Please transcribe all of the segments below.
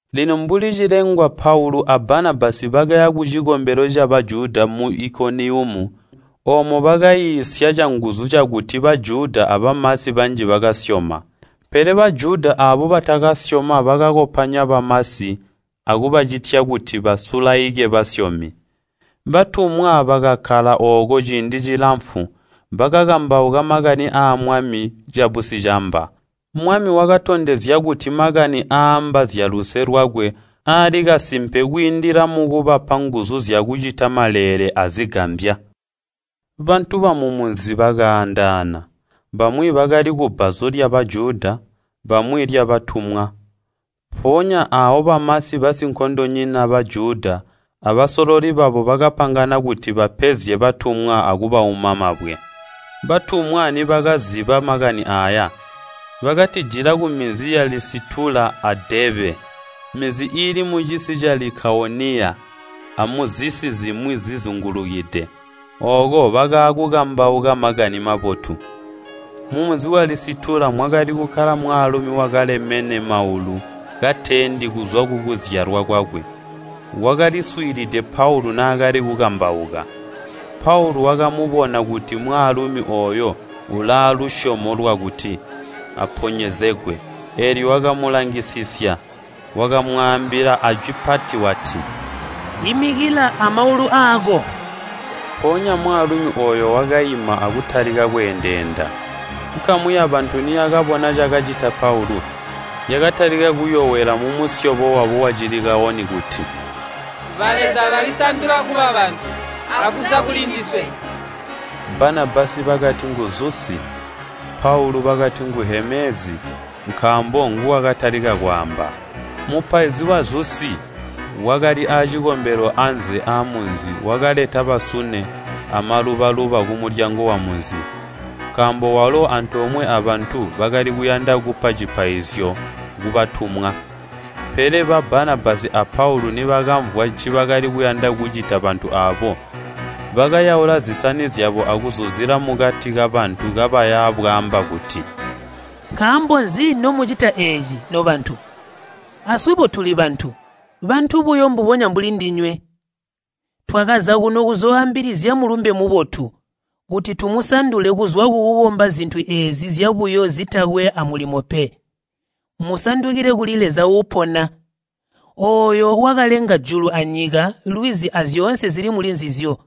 Lino mbuli cilengwa Paulu a Banabasi bakaya kucikombelo ca Bajuda mu Ikoniyumu. Oomo bakaiisya canguzu cakuti Bajuda abamasi banji bakasyoma. Pele Bajuda baabo atakasyoma bakakopanya bamasi akubacitya kuti basulaike basyomi. Batumwa bakakkala ooko ciindi cilamfu, bakakambauka makani aa Mwami cabusicamba. Mwami wakatondezya kuti makani aaamba zyaluse lwakwe alikasimpe kwiindila mukubapa nguzu zyakucita maleele azigambya. Bantu bamumunzi bakaandaana, bamwi bakali kubbazu lya Bajuda, bamwi lyabatumwa. Mpoonya aawo bamasi basinkondonyina, Bajuda, abasololi babo bakapangana kuti bapenzye batumwa akubauma mabwe. Batumwa nibakaaziba makani aaya, bakatijila kuminzi ya Lisitula a Deebe, minzi iili mucisi ca Likawoniya, amuzisi zimwi zizingulukide. Ooko bakaakukambauka Makani Mabotu. Mumunzi wa Lisitula mwakali kukkala mwaalumi wakalemene maulu kateendi kuzwa kukuzyalwa kwakwe. Wakaliswiilide Paulu naakali kukambauka. Paulu wakabona kuti mwaalumi ooyo uulaalusyomo lwakuti aponyezegwe, eelyo wakamulangisisya. Wakamwaambila ajwi pati wati, “Imikila amaulu aako!” Mpoonya mwaalumi ooyo wakaima akutalika kweendeenda. Nkamu yabantu niyakabona cakacita Paulu, yakatalika kuyowela mumusyobo wabo wa Cilikawoni kuti, “Baleza balisandula kuba bantu akuza kulindiswe!” Banabasi bakati ngu Zusi, Paulu bakati ngu Heemezi, nkaambo nguwakatalika kwaamba. Mupaizi wa Zusi, wakali aacikombelo anze aamunzi wakaleta basune amaluba-luba kumulyango wamunzi. Nkaambo walo antoomwe abantu bakali kuyanda kupa cipaizyo kubatumwa. Pele ba Banabasi a Paulu nibakamvwa ncibakali kuyanda kucita bantu aabo, bakayaula zisani zyabo akuzuzila mukati kabantu kabaya bwaamba kuti, “Nkaambo nzi nomucita eeci, nobantu? Aswebo tuli bantu, bantu buyo mbubonya mbuli ndinywe! Twakaza kuno kuzooambilizya Mulumbe Mubotu, kuti tumusandule kuzwa kukukomba zintu eezi zyabuyo zitakwe amulimo pe, musandukile kuli Leza uupona. Ooyo wakalenga julu anyika, lwizi azyoonse zili mulinzizyo.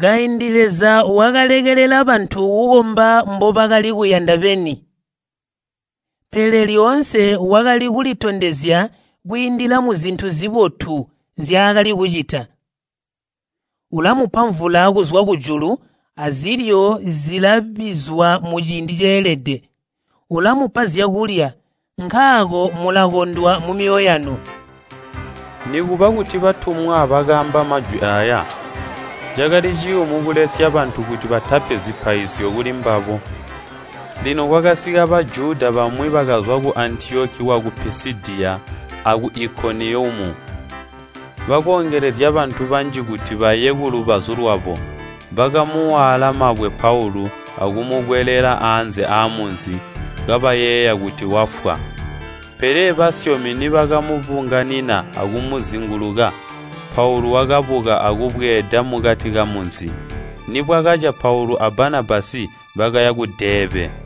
Kaindi Leza wakalekelela bantu kukomba mbobakali kuyanda beni. Pele lyoonse wakali kulitondezya kwiindila muzintu zibotu nzyaakali kucita. Ulamupa mvula kuzwa kujulu azilyo zilabizwa muciindi ceelede. Ulamupa zyakulya, nkaako mulakondwa mumyoyo yanu.” Nikuba kuti batumwa bakaamba majwi aaya, cakali ciyumu kulesya bantu kuti batapi zipaizyo kulimbabo. Lino kwakasika Bajuda bamwi bakazwa ku Antiyoki waku Pisidiya aku Ikoniyumu. Bakoongelezya bantu banji kuti baye kulubazu lwabo, bakamuwaala mabwe Paulu akumukwelela anze aamunzi, kabayeeya kuti wafwa. Pele basyomi nibakamubunganina akumuzinguluka, Paulu wakabuka akubweeda mukati kamunzi. Nibwakaca Paulu a Banabasi bakaya ku Deebe.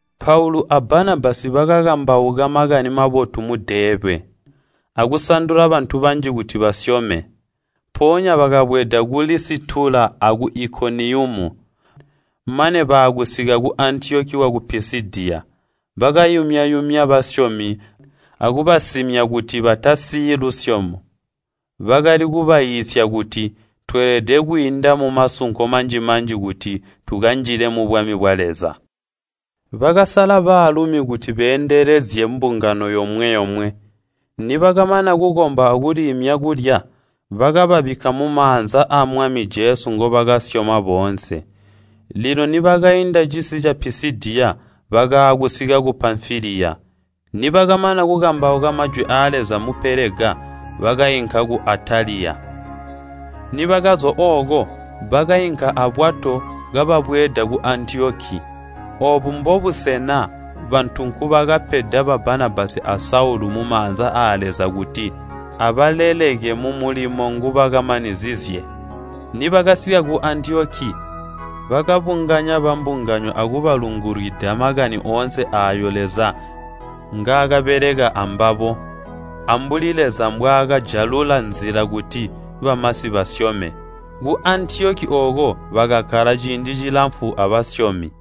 Paulu a Banabasi bakakambauka Makani Mabotu mu Deebe, akusandula bantu banji kuti basyome. Mpoonya bakabweeda ku Lisitula aku Ikoniyumu, mane baakusika ku Antiyoki waku Pisidiya. Bakayumya-yumya basyomi akubasimya kuti batasiyi lusyomo. Bakali kubaiisya kuti, “Tweelede kwiinda mumasunko manji-manji kuti tukanjile mubwami bwa Leza.” Bakasala baalumi kuti beendelezye mbungano yomwe-yomwe, nibakamana kukomba akuliimya kulya, bakababikka mumaanza aa Mwami Jesu ngobakasyoma boonse. Lino nibakainda cisi ca Pisidiya bakaakusika ku Pamfiliya. Nibakamana kukambauka majwi aa Leza mu Pelega, bakainka ku Ataliya. Nibakazwa ooko, bakainka abwato kababweeda ku Antiyoki. Oobu mbobusena bantu nkubakapeda ba Banabasi a Saulu mumaanza aa Leza kuti abaleleke mumulimo ngobakamanizizye. Nibakasika ku Antiyoki, bakabunganya bambungano akubalungulwida makani oonse aayo Leza ngaakabeleka ambabo, ambuli Leza mbwaakajalula nzila kuti bamasi basyome. Ku Antiyoki ooko bakakkala ciindi cilamfu abasyomi.